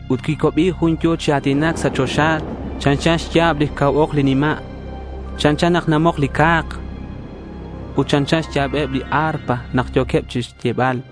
Ut quicuabi jun yo̱ chi a̱tinac sa' choxa chanchan xya̱b lix cau ok li nima'. Chanchan nak namok li ca̱k. Ut chanchan xya̱beb li arpa nak yo̱queb xch'e'bal.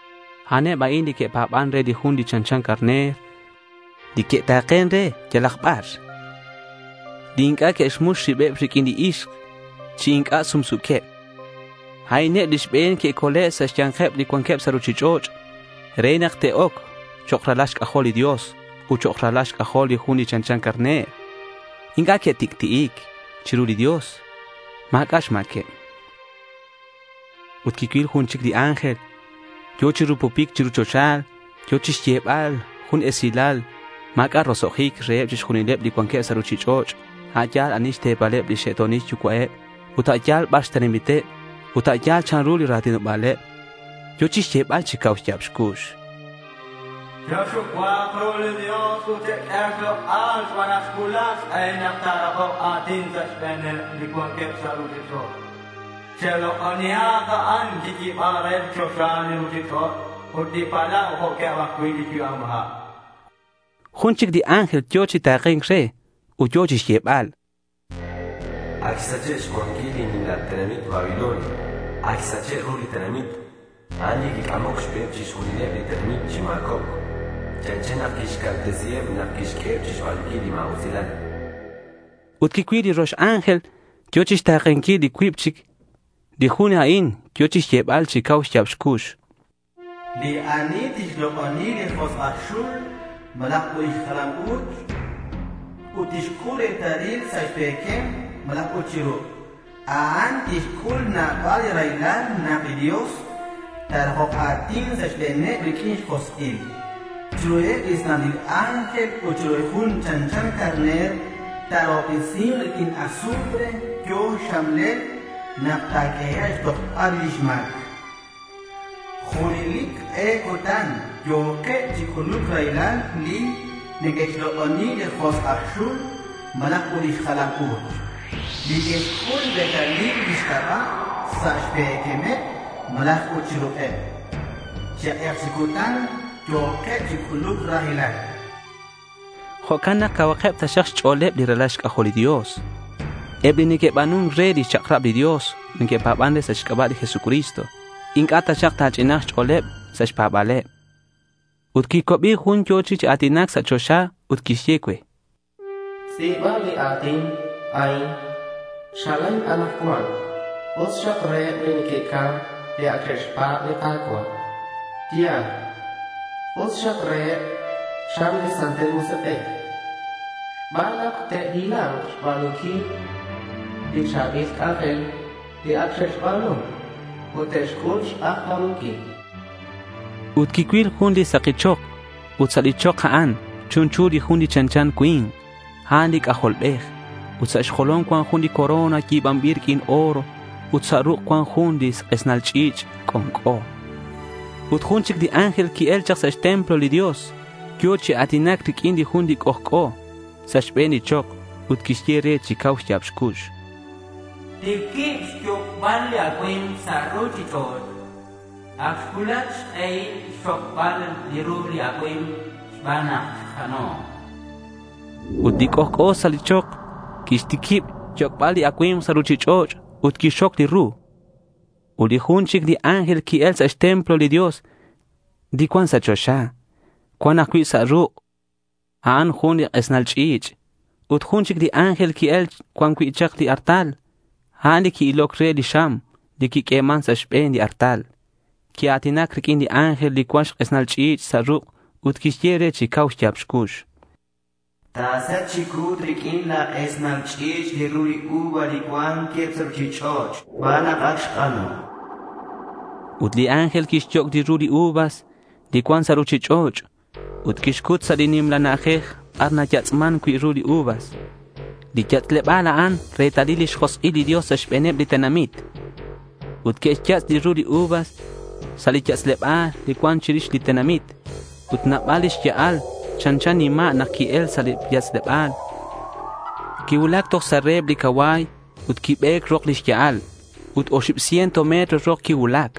A'aneb a'in li que'pa̱ban re li Jun li chanchan carner, li que'ta̱ken re yalak bar, li inc'a' que'xmux ribeb riq'uin ixk chi inc'a' sumsu̱queb. A'ineb li xbe̱n que'cole' sa' xya̱nkeb li cuanqueb sa' ruchich'och' re nak te'oc chok' ralal xc'ajol li Dios ut chok' ralal xc'ajol li Jun li chanchan carner. Inc'a' que'tic'ti'ic. Chiru li Dios ma̱c'a' xma̱queb. Ut quicuil jun chic li ángel yo̱ chi rupupic chiru choxa. Yo̱ chixyebal jun esilal li ma̱c'a' roso'jic reheb chixjunileb li cuanqueb sa' ruchich'och' a' yal ani xte̱paleb lix xe'to̱nil yucua'eb, ut a' yal bar xtenamiteb ut a' yal chanru li ra̱tinoba̱leb. Yo̱ chixyebal chi cau xya̱b xcux: —Chexucua̱k ru li Dios ut cheq'ue xlok'al xban nak xcuulac xk'ehil nak ta̱rakok a̱tin sa' xbe̱neb li cuanqueb sa' ruchich'och'. Chelok'onihak a'an li quiyi̱ban re li choxa, li ruchich'och', ut li palau jo'queb ajcui' li yu'am ha', chan. Jun chic li ángel yo̱ chi ta̱ke̱nc re ut yo̱ chixyebal: —Ac xsache' xcuanquil li nimla tenamit Babilonia. Ac xsache' ru li tenamit. A'an li quic'amoc xbeheb chixjunileb li tenamit chi ma̱cobc. Chanchan nak quixcaltesiheb nak quixq'ueheb chixba̱nunquil li ma̱usilal, chan. Ut quicuil li rox ángel, yo̱ chixta̱kenquil li cuib chic. Li jun a'in yo̱ chixyebal chi cau xya̱b xcux: —Li ani tixlok'oni li josk' aj xul malaj ut lix jalam u̱ch, ut tixc'ul li retalil sa' xpe̱quem malaj chi ruk', a'an tixc'ul nabal li raylal nak li Dios ta̱rakok a̱tin sa' xbe̱neb riq'uin xjosk'il. Chiruheb li santil ángel ut chiru li Jun li chanchan carner ta̱rahobtesi̱k riq'uin azufre yo̱ xxamlel nak ta̱q'uehek' chixtojbal rix lix ma̱c. Junelic k'e cutan yo̱keb chi c'uluc raylal li neque'xlok'oni li josk' aj xul malaj ut lix jalam u̱ch, li que'xc'ul li retalil lix c'aba' sa' xpe̱quemeb malaj chi ruk'eb. Chi k'ek chi cutan yo̱keb chi c'uluc raylal, chan. Jo'can nak cauhakeb taxak xch'o̱leb li ralal xc'ajol li Dios, eb li neque'ba̱nun re lix chak'rab li Dios ut neque'pa̱ban sa' xc'aba' li Jesucristo. Inc'a' taxak ta̱ch'ina̱nk xch'o̱leb sa' xpa̱ba̱leb. Ut quicuabi jun yo̱ chi a̱tinac sa' choxa ut quixye cue: —Tz'i̱ba li a̱tin a'in: Chalen anakcuan us xak reheb li neque'cam, li ac xe'xpa̱b li Ka̱cua'. Ya̱l. Us xak reheb, chan li Santil Musik'ej, xban nak te'hila̱nk chixba̱nunquil li cha̱bil c'anjel li ac xe'xba̱nu ut te'xc'ul xk'ajca̱munquil.— Ut quicuil jun li saki chok. Ut sa' li chok a'an, chunchu li Jun chanchan cui̱nk. A'an li C'ajolbej. Ut sa' xjolom cuan jun li corona yi̱banbil riq'uin oro ut sa' ruk' cuan jun li k'esnal ch'i̱ch' c'onc'o. Ut jun chic li ángel qui-el chak sa' xtemplo li Dios. Yo̱ chi a̱tinac riq'uin li Jun li c'ojc'o sa' xbe̱n li chok ut quixye re chi cau xya̱b xcux: —Tiquib xyoc'bal li acui̱mk sa' ruchich'och'. Ac xcuulac xk'ehil xxocbal li ru li acui̱mk xban nak ac xk'ano', chan. Ut li c'ojc'o sa' li chok quixtiquib xyoc'bal li acui̱mk sa' ruchich'och' ut quixxoc li ru. Ut jun chic li ángel qui-el sa' xtemplo li Dios, li cuan sa' choxa. Cuan ajcui' sa' ruk' a'an jun li k'esnal ch'i̱ch'. Ut jun chic li ángel qui-el cuan cui' li artal. A'an li qui-iloc re li xam li naq'ueman sa' xbe̱n li artal. Quia̱tinac riq'uin li ángel li cuan xk'esnal ch'i̱ch' sa' ruk' ut quixye re chi cau xya̱b xcux: —Ta̱set chi cu̱t riq'uin la̱ k'esnal ch'i̱ch' li ru li uva li cuanqueb sa' ruchich'och' xban nak ac xk'ano', chan. Ut li ángel quixyoc' li ru li uva li cuan sa' ruchich'och'. Ut quixcut sa' li nimla na'ajej bar nayatz'man cui' li uva. Li yatz'leba̱l a'an retalil lix josk'il li Dios sa' xbe̱neb li tenamit. Ut que'xyatz' li ru li uvas sa' li yatz'leba̱l li cuan chirix li tenamit. Ut nabal li xya'al. Chanchan nima' nak qui-el sa' li yatz'leb. Quicuulac toj sa' reheb li cacua̱y ut quibe̱c rok lix ya'al ut oxib ciento metro rok quicuulac.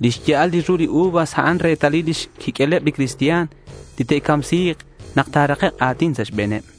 (Lix ya'al li ru li uvas a'an retalil xquiq'ueleb li cristian li te'camsi̱k nak ta̱rakek' a̱tin sa' xbe̱neb).